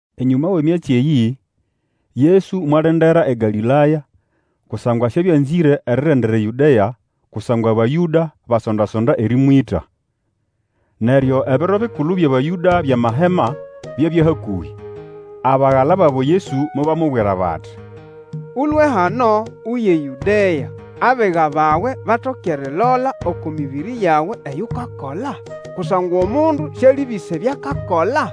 Enyũma wʼemyatsi eyĩ, Yesu mwalendera eGalĩlaya, kusangwa siabya anzĩre erirendera eYũdea kusangwa Abayũda basonda-sonda erĩmwĩta. Neryo ebiro bikulu byʼAbayũda byʼamahema byabya hakũhĩ. Abagala babo Yesu mobamubwira bati, Ũlũe hano, uye eYũdea, abiga bawe batoke erilola oko mĩbĩrĩ yawe eyo ukakola. Kusangwa omundu sialĩbĩsa ebyo akakola,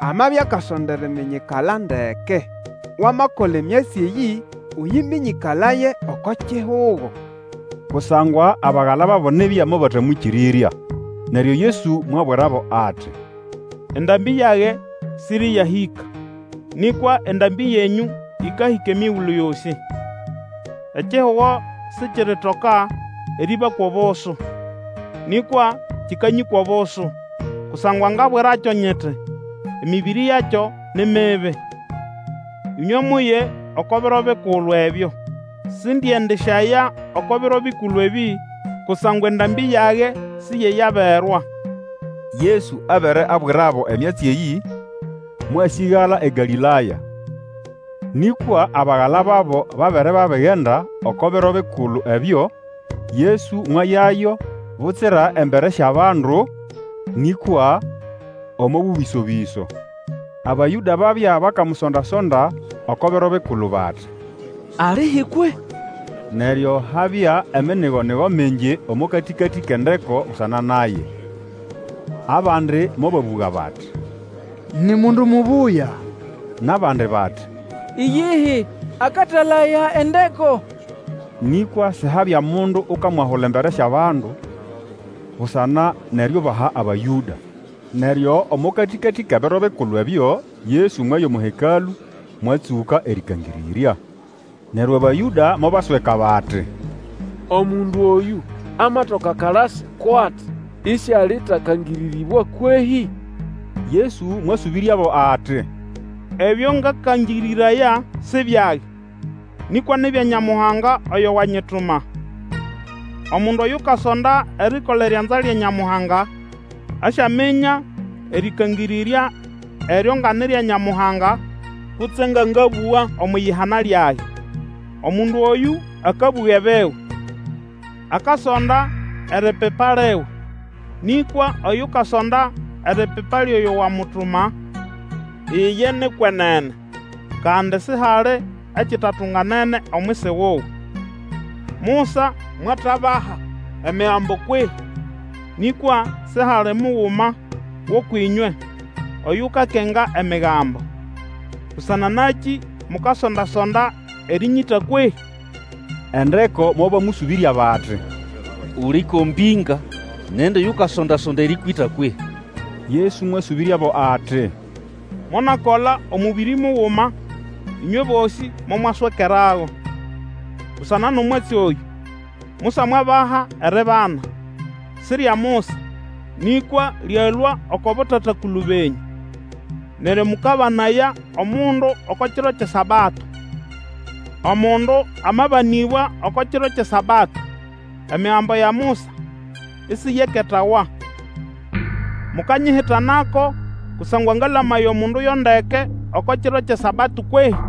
amabya akasonda eriminyikala ndeke. Wamakola emyatsi eyĩ ũyĩmĩnyĩkalaye oko kihugo. Kusangwa abagala babo nibya mobatamwĩkĩrĩrya. Neryo Yesu mwabũga nabo ati, Endambĩ yage siriyahĩka, nĩkwa endambĩ yenyũ ĩkahĩka emigulu yosĩ. Ekihugo sikiritoka erĩbakwa obusu, nĩkwa kĩkanyĩkwa obusu, kusangwa ngabwirakyo nyiti emĩbĩrĩ yakyo ni mibi. Ĩnywe muye oko biro bikulu ebyo. Sindiendisyaya oko biro bikulu ebĩ, kusangwa endambĩ yage siyeyaberwa. Yesu abere abwirabo emyatsi eyĩ, mwasĩgala eGalĩlaya. Nĩkwa abagala babo babere babigenda oko biro bikulu ebyo, Yesu mwayayo butsira embere syʼabandu, nĩkwa omo bũbĩso-bĩso. Abayũda babya bakamusonda-sonda oko biro bikulu, bati, Alihi kwehĩ? Neryo habya eminigonigo mingi omo katĩkatĩ kʼendeko busana naye. Abandi mobabũga bati, Ni mundu mubuya, nʼabandi bati, Iyihi, akatalaya endeko. Nĩkwa sihabya mundu ukamwahula embere syʼabandu, busana nʼeriubaha Abayũda. Neryo omo katĩkatĩ kʼebiro bikulu ebyo Yesu mwaya omo Hekalũ, mwatsũka erĩkangĩrĩrya. Neryo Abayũda mobasweka bati, Omundu oyũ amatoka akalasi ko ati isialitakangĩrĩrĩbwa kwehĩ? Yesu mwasũbĩryabo ati, Ebyo ngakangĩrĩraya si byage, nĩkwa ni bya Nyamuhanga oyo wanyituma. Omundu Oyukasonda erikola erianza lya Nyamuhanga, asyaminya erĩkangĩrĩrya eryo nga ni rya Nyamuhanga kutse nga ngabũga omwʼiyihana lyage. Omundu oyũ akabũga ebiwe, akasonda eripipa liwe; nĩkwa Oyukasonda eripipa lyʼoyo wamutuma, iye ni kwenene, kandi sihali ekitatunganene omwisi wuwe. Musa mwatabaha Emigambo kwehĩ? Nĩkwa sihali muguma gʼũkwʼĩnywe oyukakenga Emigambo. Busana nakĩ mukasonda-sonda erĩnyĩta kwehĩ? Endeko mobamũsũbĩrya bati, Uli ko mbĩnga! Nindi yukasonda-sonda erĩkwĩta kwehĩ? Yesu mwasũbĩryabo ati, Monakola omũbĩrĩ muguma, ũnywe bosĩ momwaswekerago. Busana nʼomwatsi oyũ, Musa mwabaha eribana. Si rya Musa, nĩkwa lyalũa oko botata-kulu benyũ. Neryo mũkabanaya omundu oko kiro kyʼeSabato. Omundu amabanĩbwa oko kiro kyʼeSabato, Emigambo ya Musa isiyeketawa, mukanyihitanako kusangwa ngalamaya omundu yo ndeke oko kiro kyʼeSabato kwehĩ?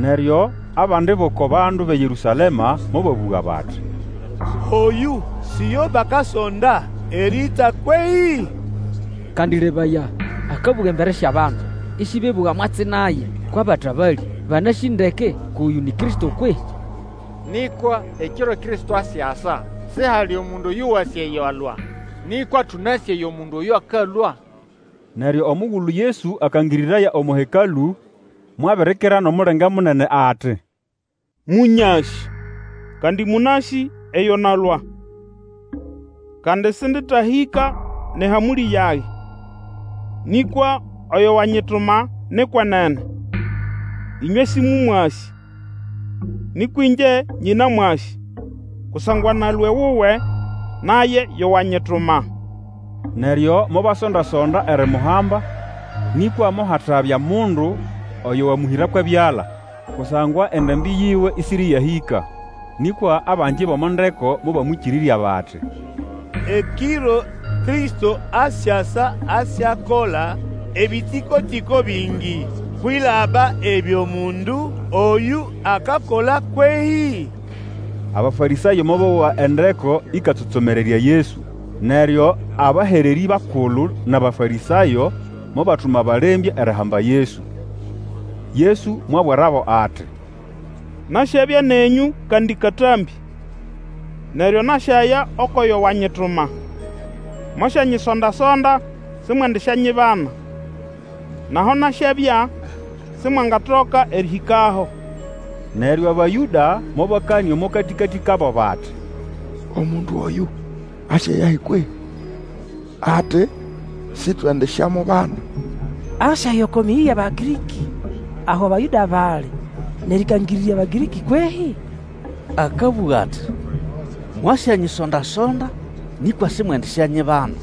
Neryo abandi bʼoko bandu bʼeYerũsalema mobabũga bati, Oyũ si yo bakasonda erĩĩta kwehĩ? Kandi lebaya, akabũga embere syʼabandu, ĩsĩbebũga mwatsi naye! Kwʼabatabalĩ banasĩ ndeke kwʼoyũ ni Kristo kwehĩ? Nĩkwa ekiro Kristo asyasa, sihali mundu oyo wasĩ eyo alũa. Nĩkwa tũnasĩ eyo mundu oyũ akalũa. Neryo omugulu Yesu akangĩrĩraya omo Hekalũ, mwabirikira nʼomulenge munene ati, Mũnyasĩ, kandi mũnasĩ eyo nalũa. Kandi sĩndĩtahĩka nʼehamũlĩ yage. Nĩkwa oyo wanyituma ni kwenene. Inywe sĩmũmwasĩ. Nĩkwa ĩngye nyĩnamwasĩ, kusangwa nalũa ewuwe, naye yo wanyituma. Neryo mobasonda-sonda erimuhamba, nĩkwa mohatabya mundu oyo wamũhĩra kwʼebyala, kusangwa endambĩ yiwe ĩsĩrĩyahĩka. Nĩkwa abangi bʼomo ndeko mobamwĩkĩrĩrya bati, Ekiro Kristo asyasa asyakola ebitiko-tiko bingi kwilaba ebyo mundu oyũ akakola kwehĩ? Abafarĩsayo mobowa endeko ĩkatsomererya Yesu. Neryo abahererĩ bakulu nʼAbafarĩsayo mobatuma balembya erihamba Yesu. Yesu mwabwirabo ati, Nasyabya nenyũ kandi katambĩ, neryo nasyaya ukwʼoyo wanyituma. Mwasyanyisonda-sonda, simwendisyanyibana, nʼaho nasyabya Simwangatoka erĩhĩkaho. Neryo Abayũda mobakanĩa omo katĩkatĩ kabo bati, Omundu oyũ asyayahi kwehĩ? ati, Sitwendisyamubana. Asyaya oko mĩyĩ yʼAbagĩrĩkĩ aho Abayũda bali, nʼerĩkangĩrĩrya Abagĩrĩkĩ kwehĩ? Akabũga ati, Mwasyanyisonda-sonda, nĩkwa simwendisyanyibana,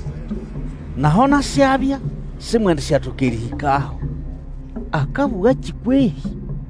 nʼaho nasyabya simwendisyatoka erĩhĩkaho. Akabũgakĩ kwehĩ?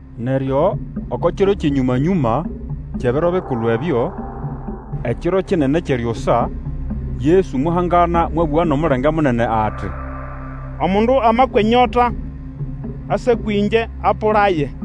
Neryo oko kiro kyʼenyũma-nyũma kyʼebiro bikulu ebyo, ekiro kinene kyʼeryusa, Yesu mwahangana mwabũga nʼomulenge munene ati, Omundu amakwa enyota, ase kwĩngye apũlaye.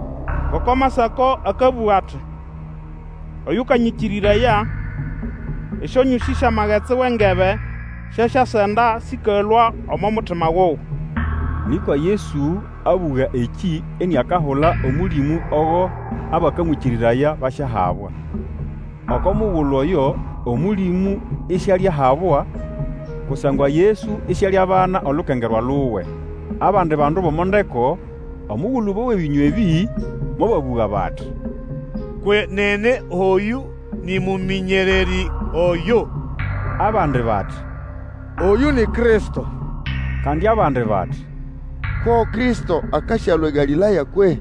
Ngoko Amasako akabũga ati, Oyũkanyĩkĩrĩraya, esyonyũsĩ syʼamagetsi wʼengebe syasyasenda sĩkalũa omo mutima wuwe. Nĩkwa Yesu abũga ekĩ iniakahula Omũlĩmũ ogo abakamwĩkĩrĩraya basyahabwa. Oko mugulu oyo Omũlĩmũ isialiahabwa, kusangwa Yesu isialiabana olukengerwa luwe. Abandi bandu bʼomo ndeko, omugulu bowa ebĩnywa ebĩ, mobabũga bati, Kwenene oyũ nĩ Mũmĩnyererĩ oyo! Abandi bati, Oyũ ni Kristo! Kandi abandi bati, Ko Kristo akasyalũa eGalĩlaya kwehĩ?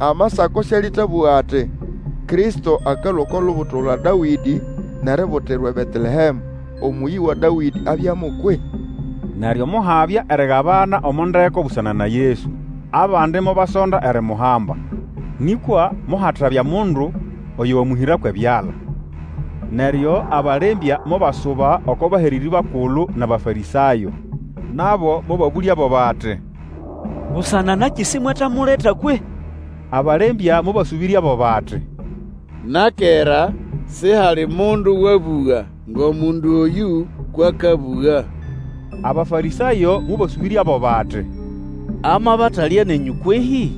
Amasako Sĩalĩtabũga ati, Kristo akalũa oko lubuto lwa Dawĩdĩ, nʼeributirwa eBetelehemũ, omũyi wa Dawĩdĩ abyamo kwehĩ? Neryo mohabya erigabana omo ndeko busana na Yesu. Abandi mobasonda erimuhamba, nĩkwa mohatabya mundu oyo wamũhĩra kwʼebyala. Neryo abalembya mobasuba oko bahererĩ bakulu nʼAbafarĩsayo. Nabo mobabũlyabo bati, Busana nakĩ simwetamuleta kwehĩ? Abalembya mobasũbĩryabo bati, Na kera sihali mundu wabuga ngʼomundu oyũ kwʼakabũga. Abafarĩsayo mobasũbĩryabo bati, Amabatalya nenyũ kwehĩ?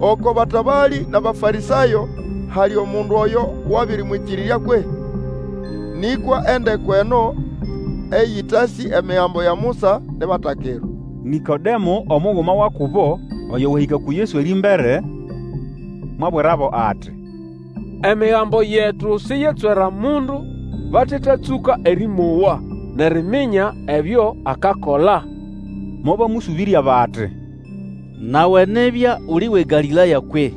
Oko batabalĩ nʼAbafarĩsayo hali omundu oyo wabĩrĩmwĩkĩrĩrya kwehĩ? Nĩkwa endeko eno eyĩtasĩ Emigambo ya Musa ni batakirwa. Nĩkodemo omuguma wa kubo, oyo wahĩka uku Yesu erĩmbere, mwabwirabo ati, Emigambo yetu siyetswera mundu batetatsũka erĩmowa, nʼeriminya ebyo akakola. Mobamũsũbĩrya bati, Nawe nibya uli wʼeGalĩlaya kwehĩ?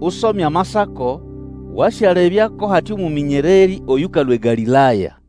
Usome Amasako, wasyalebya ko hate omũmĩnyererĩ oyũkalũa eGalĩlaya.